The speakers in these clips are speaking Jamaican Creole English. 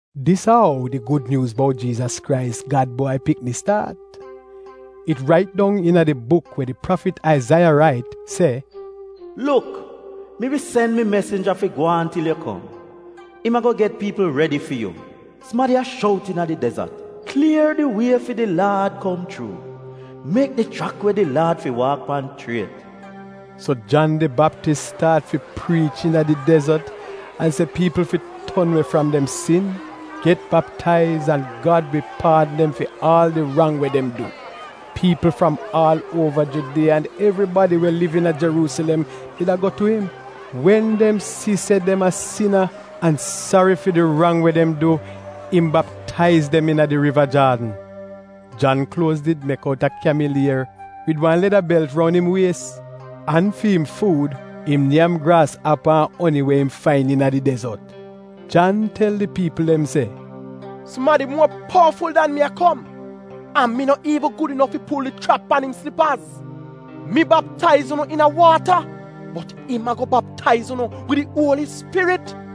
Dis a ou di Gud Nyuuz bout Jiizas Krais, Gad Bwai Pikni staat. It rait dong iina di buk we di prafit Aizaiya rait, se: “Luk, mi wi sen mi mesinja fi gwaan til yu kom, im ago get piipl redi fi yu.” “Sumadi a shout iina di dezot, ‘Klier di wie fi di Laad kom chuu, mek di chrak we di Laad fi waak pan chriet.’” So Jan di Baptis staat fi priich iina di dezot an se piipl fi ton we fram dem sin, get baptaiz, an Gad wi paadn dem fi aal di rang we dem du. Piipl fram aal uova Judiya an evribadi we liv iina Jeruusilem did a go tu im. Wen dem si se dem a sina, an sari fi di rang we dem du, im baptaiz dem iina Riva Jaadn. Jan kluoz did mek outa kyamil ier wid wan leda belt roun im wies. An fi im fuud im nyam graasapa an oni we im fain iina di dezot. Jan tel di piipl dem se, “Sumadi muo powaful dan mi a kom an mi no iivn gud inof fi pul di schrap pan im slipaz. Mi baptaiz unu iina waata, bot im ago baptaiz unu wid di Uoli Spirit.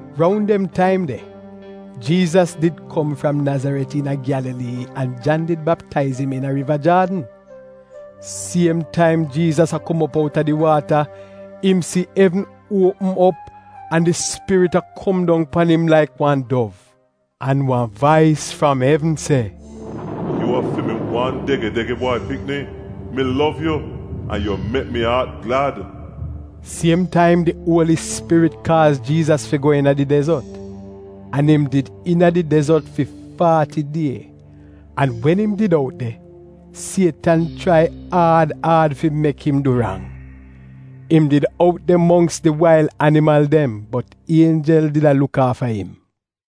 Roun dem taim de, Jiizas did kom fram Nazaret iina Gyalalii an Jan did baptaiz im iina Riva Jaadn. Siem taim Jiizas a kom op outa di waata, im si evn opm op an di Spirit a kom dong pan im laik wan dov. An wan vais fram evn se, “Yu a fi mi wan dege-dege Bwai Pikni, mi lov yu an yu mek mi aat glad.” Siem taim di Uoli Spirit kaaz Jiizas fi go iina di dezot. An im did iina di dezot fi faati die. An wen im did out de, Sietan chrai aad aad fi mek im du rang. Im did out de mongks di wail animal dem bot ienjel did a luk aafa im.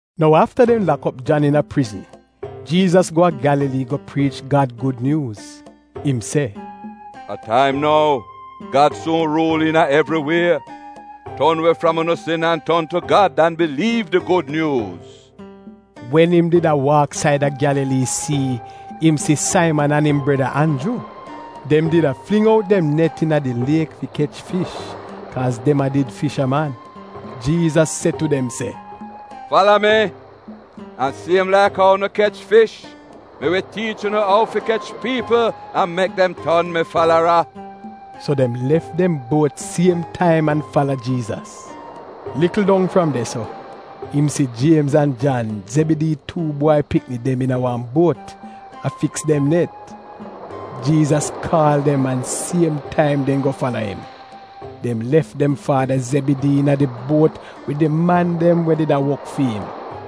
Nou afta dem lak op Jan iina prizn, Jiizas go a Gyalalii go priich Gad gud nyuuz. Im se, “A taim nou! Gad suun ruul iina evri wie! Ton we fram unu sin an ton tu Gad an biliiv di gud nyuuz! Wen im did a waak saida Gyalalii sii, im si Saiman an im breda Anju. Dem did a fling out dem net iina di liek fi kech fish kaaz dem a did fishaman. Jiizas se tu dem se, “Fala mi! An siem laik ou unu kech fish, mi wi tiich unu ou fi kech piipl an mek dem ton mi falara.” So dem lef dem buot siem taim an fala Jiizas. Likl dong fram de-so, im si Jiemz an Jan, Zebidii tuu bwai pikni dem iina wan buot a fiks dem net. Jiizas kaal dem an siem taim dem go fala im. Dem lef dem faada Zebidii iina di buot wid di man dem we did a wok fi im.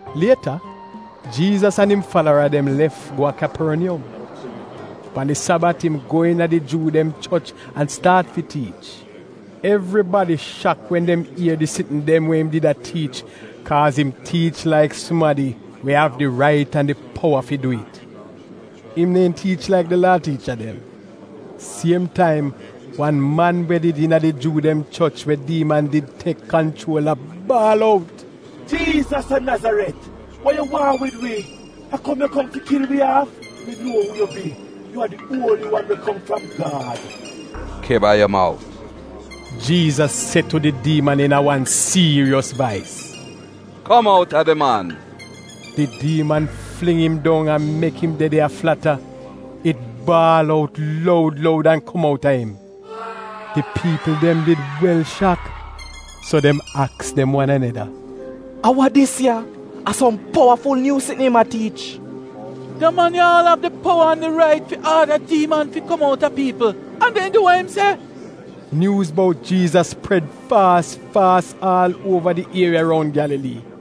Lieta Jiizas an im falara dem lef go a Kyaporniyom. Pan di Sabat im go iina di Juu dem choch an staat fi tiich. Evribadi shak wen dem ier di sitn dem we im did a tiich, kaaz im tiich laik sumadi we av di rait an di powa fi du it. Im neehn tiich laik di Laa tiicha dem. Siem taim wan man we did iina di Juu dem choch we diiman did tek kanchuol a baal out, “Jiizas a Nazaret, wa yu waahn wid wi? A kom yu kom fi kil wi aaf? Mi nuo uu yu bi! Yu a di Uoli Wan we kom fram Gad!” “Kiba yu mout!” Jiizas se tu di diiman iina wan siiriyos vais. “Kom outa di man!” Di diiman fling im dong an mek im de de a flata, it baal out loud loud an kom out a im. Di piipl dem did wel shak, so dem aks dem wan aneda, “A wa dis ya? A som powaful nyuu sitn im a tiich! Da man ya aal av di powa an di rait fi aada diiman fi kom outa piipl an dem du wa im se.” Nyuuz bout Jiizas pred faas faas aal uova di ieriya roun Gyalalii.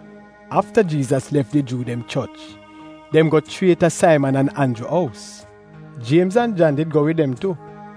Afta Jiizas lef di Juu dem choch, dem go chriet a Saiman an Anju ous. Jiemz an Jan did go wid dem tu.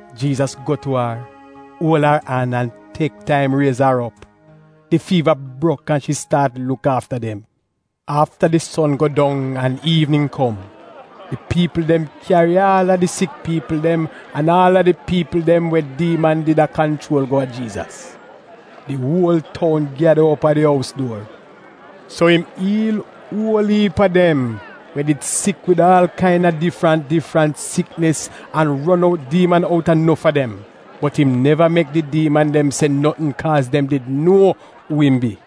Jiizas go tu ar, uol ar an an tek taim riez ar op. Di fiiva brok an shi staat luk aafa dem. Afta di son go dong an iivnin kom, di piipl dem kyari aal a di sik piipl dem an aal a di piipl dem we diiman did a kanchuol go a Jiizas. Di uol toun gyada op a di ous duor. So im iil uol iip a dem we did sik wid aal kaina difrant difrant siknis an ron out diiman outa nof a dem. Bot im neva mek di diiman dem se notn kaaz dem did nuo uu im bi.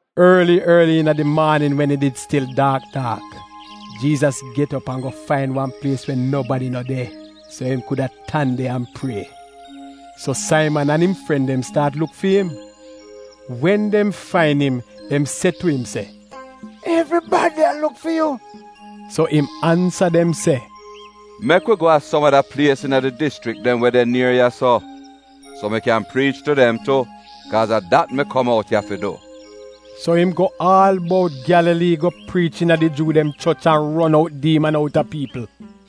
Orli orli iina di maanin, wen it did stil daak daak, Jiizas get op an go fain wan plies we nobadi no de, so im kuda tan de an prie. So Saiman an im fren dem staat luk fi im. Wen dem fain im, dem se tu im se, “Evribadi a luk fi yu!” So im ansa dem se, “Mek wi go a som ada plies iina di dischrik dem we de nier ya-so, so mi kyan priich tu dem tu, kaaz a dat mi kom out ya fi du.” So im go aal bout Gyalalii go priich iina di Juu dem choch an ron out diiman outa piipl.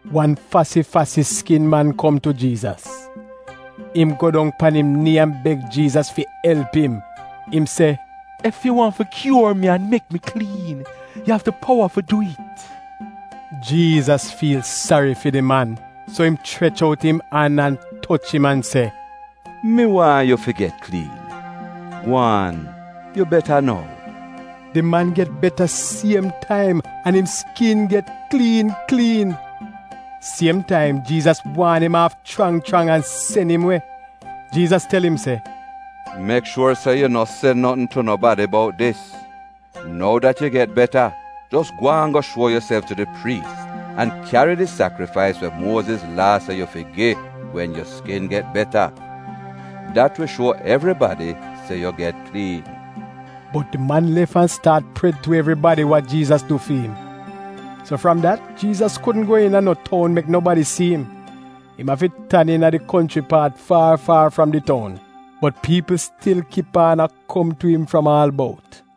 Wan fasi-fasi skin man kom tu Jiizas. Im go dong pan im nii an beg Jiizas fi elp im. Im se, “Ef yu waahn fi kyuor mi an mek mi kliin, yu av di powa fi dwi'it.” Jiizas fiil sari fi di man, so im chrech out im an an toch im an se, “Mi waahn yu fi get kliin. Gwaan, yu beta nou!” Di man get beta siem taim an im skin get kliin kliin. Siem taim Jiizas waan im aaf chrang chrang an sen im we. Jiizas tel im se, “Mek shuor se yu no se notn tu nobadi bout dis. Nou dat yu get beta, jos gwaan go shuo yuself tu di priis an kyari di sakrifais we Muoziz Laa se yu fi gi wen yu skin get beta. Dat wi shuo evribadi se yu get kliin.” Bot di man lef an staat pred tu evribadi wa Jiizas du fi im. So fram dat Jiizas kudn go iina no toun mek nobadi si im. Im afi tan iina di konchri paat faar faar fram di toun. Bot piipl stil kip aan a kom tu im fram aal bout.